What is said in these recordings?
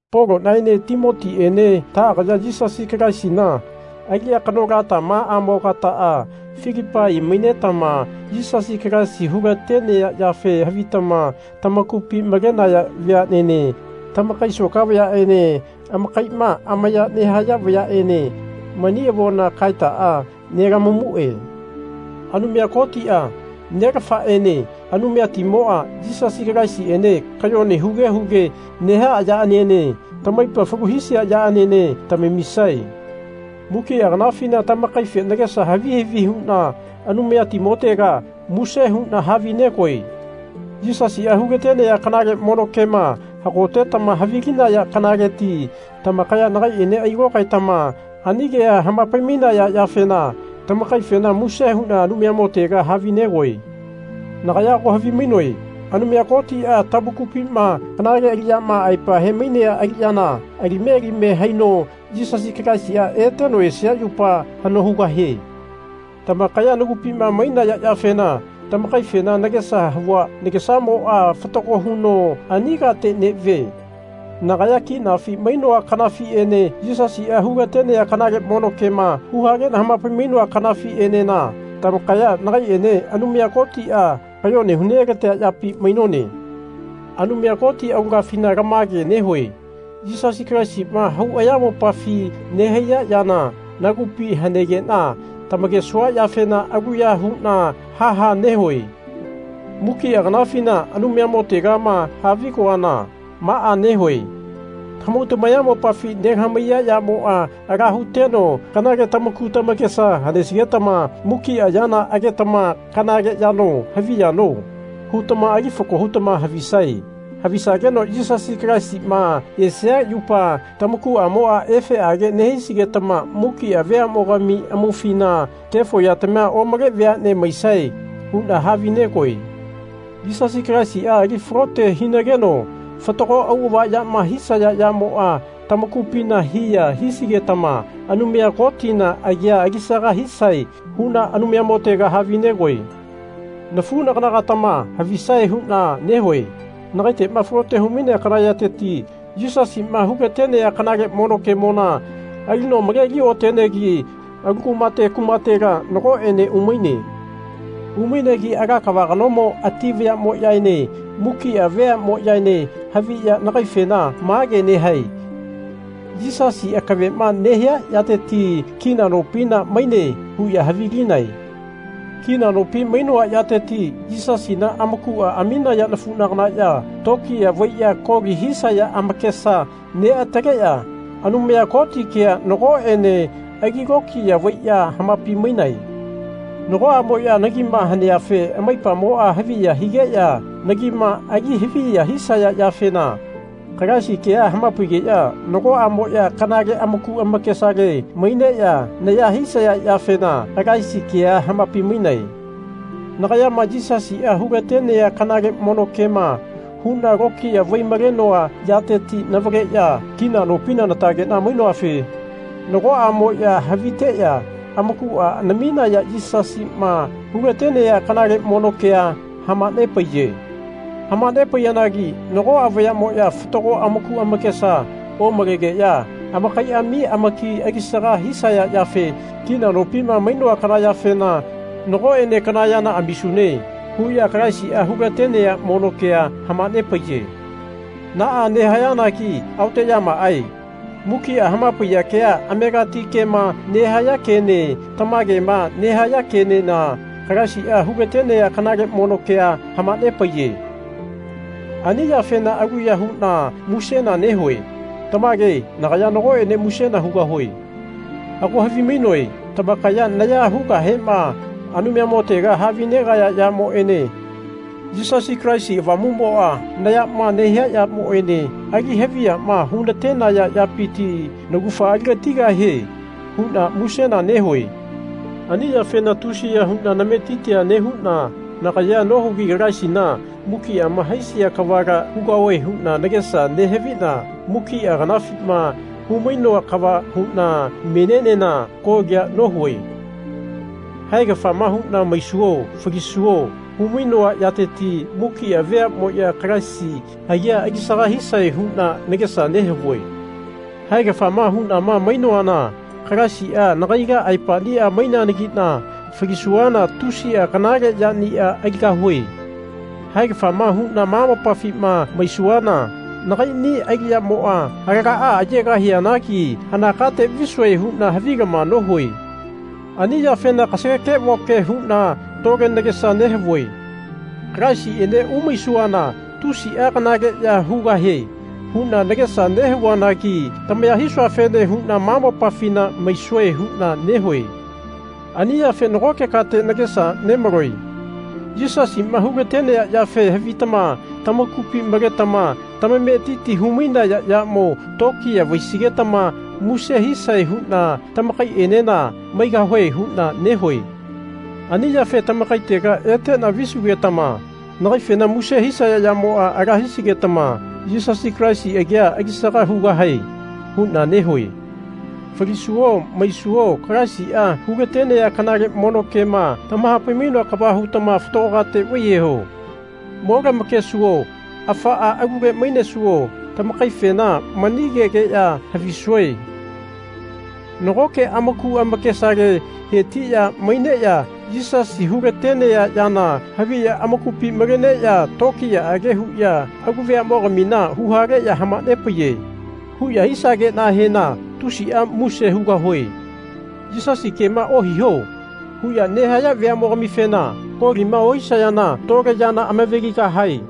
Polonaene Timotiene taagaya Yisasi Kalaisina aliya kanolatamaa-mogataa Filipai mainetama Yisasi Kalaisi hulatenea yafe havitama tamakupi malenaya veanene tamakai soka vayaene amakaima amaya nehaya vayaene mani avona kaetaa nelamamue. Anumaya Kotia, Nelafaene Anumayatimoa, Yisasi Kalaisiene kayone huge huge nehaa yaaniene tamaipa falu hisia yaaniene tamamisae. Mukia kanafina tamakaife nagesa havi havi huna Anumayani-motega muse huna havinegoe. Yisasia hulatenea kanale mono kema hagotetama havilinaya kanaleti tamakaya nagaiene ailokaetama ani kea hamapai-mainaya yafena tamakaifena muse huna Anumayamotega havinegoe. Nagaya ago havimainoe Anumaya Kotia tamakupima kanale aliyama aepa hemainea aliyana alime alime haino Yisasi Kalaisi eteno esia yupa hano hugahie. Tamakaya nagupima mainaya yafena tamakaifena nagesa havua nagesamoa fatago huno ani kate nevie. Nagaya kinafi mainoa kanafiene Yisasia hulatenea kanale mono kema huhalena hamapai-mainoa kanafienena tamakaya nagaiene Anumaya Kotia kayone hu-nelatea yapi mainone. Anumaya Koti aulagafina lamage nehue Yisasi Kalaisima hau ayamopafi nehaiya yana nagupi hanegena tamakesua yafena aluya huna ha ha nehue. Mukia kanafina Anumayamo-tegama havigoana maa nehue tamahau tamayamopafi nelamahaiya yamoa ala huteno kanale tamaku tamakesa hanesigetama mukia yana agetama Kanale yano havi yano? hutama ali fako hutama havisae. Havisageno Yisasi Kalaisima esia yupa tamakuamoa efeage nehisigetama mukia veamogami amaufina kefo yatamia omale veane maisae huna havinegoe. Yisasi Kalaisia ali falote hinageno fatago auava yama hisaya yamoa tamakupina hiya hisigetama Anumaya Kotina agia alisaga hisae huna Anumayamotega havinegoe. Nafunagana-gatama havisae huna nehue nagaitema falote humainea kana yateti Yisasima hu-latenea kanale mono kemona alino maleli otenegi alu kumate kumatela nagoene umaine. Umainegi ala kava kanomo ati vayamoyaene mukia veamoyaene haviya nagaifena mage nehae Yisasi akavema nehia yateti kina nopina maine. huya havilinae. Kina nopi mainoa yateti Yisasina amakua aminaya nafunaganaya tokiya vaiya koli hisaya amakesa neataleya Anumaya Koti kea nagoene ali lokiya vaiya hamapai-mainae. Nagoamoya nagima haneafe amaipamoa haviya higeya nagima ali haviya hisaya yafena Kalaisi kea hamapaigeya nagoamoya kanale amaku amakesale maineya naya hisaya yafena Kalaisi kea hamapai-mainae. Nagayama Yisasia hu-latenea kanale mono kema huna lokiya vai-malenoa yateti navaleya kina nopina natagena mainoafe nagoamoya haviteya amakua namiya Yisasima hulatenea kanale mono kea hamanepaiye. Hamanepaiyanagi nagoa vayamoya fatago amaku amakesa omalegeya amakaiami amaki alisaga hisaya yafe kina nopima mainoa kana yafena Nagoene kana yana amisune. huya Kalaisia hu-latenea mono kea hamanepaiye. Naa nehayanagi aoteyamaae. Mukia hamapaiya kea amegati kema nehaya kene tamagema nehaya kenena Kalaisia hulatenea kanale mono kea hamanepaiye. Ani yafena aluya huna musena nehue. Tamage nagaya nagoene musena hugahue. Ago havimainoe tamakaya naya hugahema Anumayamotega havinegaya yamoene Yisasi Kalaisi Avamumoa nayama nehia yamoene ali haviyama hunatenaya yapiti naugafa aligatigahie huna musena nehue. Ani yafena tusiya huna nametitia nehuna nagayea nohigi Kalaisina mukiama haisia kavala hugahue huna nagesa nehavina mukia kanafima humainoa kava huna menienena kolia nohue. Haegafama huna maisuo falisuo humainoa yateti mukia veamoya Kalaisi agia alisaga hisae huna nagesa nehavue. Haegafama hunama mainoana Kalaisia nagaila aepania maineanagina falisuana tusia kanale yania aligahue. Haegafama huna ma mopafima maisuana nagaini aliyamoa alagaa ayegahianagi hana kate visue huna havilama nohue. Ani yafena kasageke-voke huna tole nagesa nehavue Kalaisiene umaisuana tusia kanaleya hugahie huna nagesa nehavuanagi tamaya hisuafene huna ma mopafi maisue huna nehue. Ani yafe nagoke kate nagesa nemaloe. Yisasima hulatenea yafe havitama tamakupi maletama tamametiti humainaya yamo tokiya vaisigetama muse hisae huna tamakaienena maigahue huna nehue. Ani yafe tamakaitega etena visugetama nagaifena muse hisaya yamoa ala hisigetama Yisasi Kalaisi agia alisaga hugahae huna nehue. Falisuo maisuo Kalaisia hulatenea kanale mono kema tamahapai-mainoa kava hutama fatago kate vaiyeho. Mo lamakesuo afaa alule mainesuo tamakaifena mani kegeya havisue Nagoke amaku amakesale hetiya maineya Yisasia hulatenea yana haviya amakupi maleneya tokiyaage huya alu veamogamina huhaleya hamanepaiye. huya hisagenahena tusia muse hugahue. Yisasi kema ohiho. huya nehaya veamogamifena kolima ohisayana tole yana amaveligahae.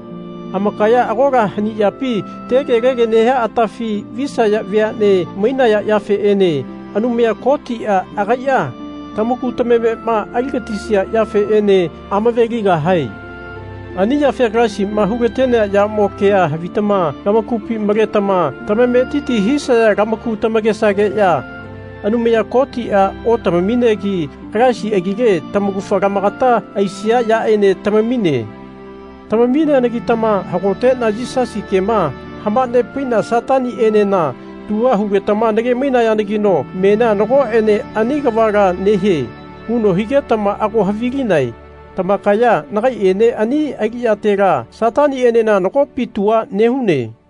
Amakaya agola hani yapi tegelege nehia atafi visaya veane mainaya yafeene Anumaya Kotia agaia tamaku tamamema aligatisia yafeene amaveligahae. Ani yafe Kalaisima hulatenea yamo kea havitama lamakupi maletama tamametiti hisaya lamaku tamakesageya Anumaya Kotia otamaminegi Kalaisi agile tamaugafa lamakata aisia yaene tamamine. Tamamineanagitama hagotena Yisasi kema hamanepaina Satanienena tua hugetama nage-mainayanagino menia nagoene ani kavala nehie huno higetama ago havilinae. Tamakaya nagaiene ani aliyatela Satanienena nagopi tua nehune.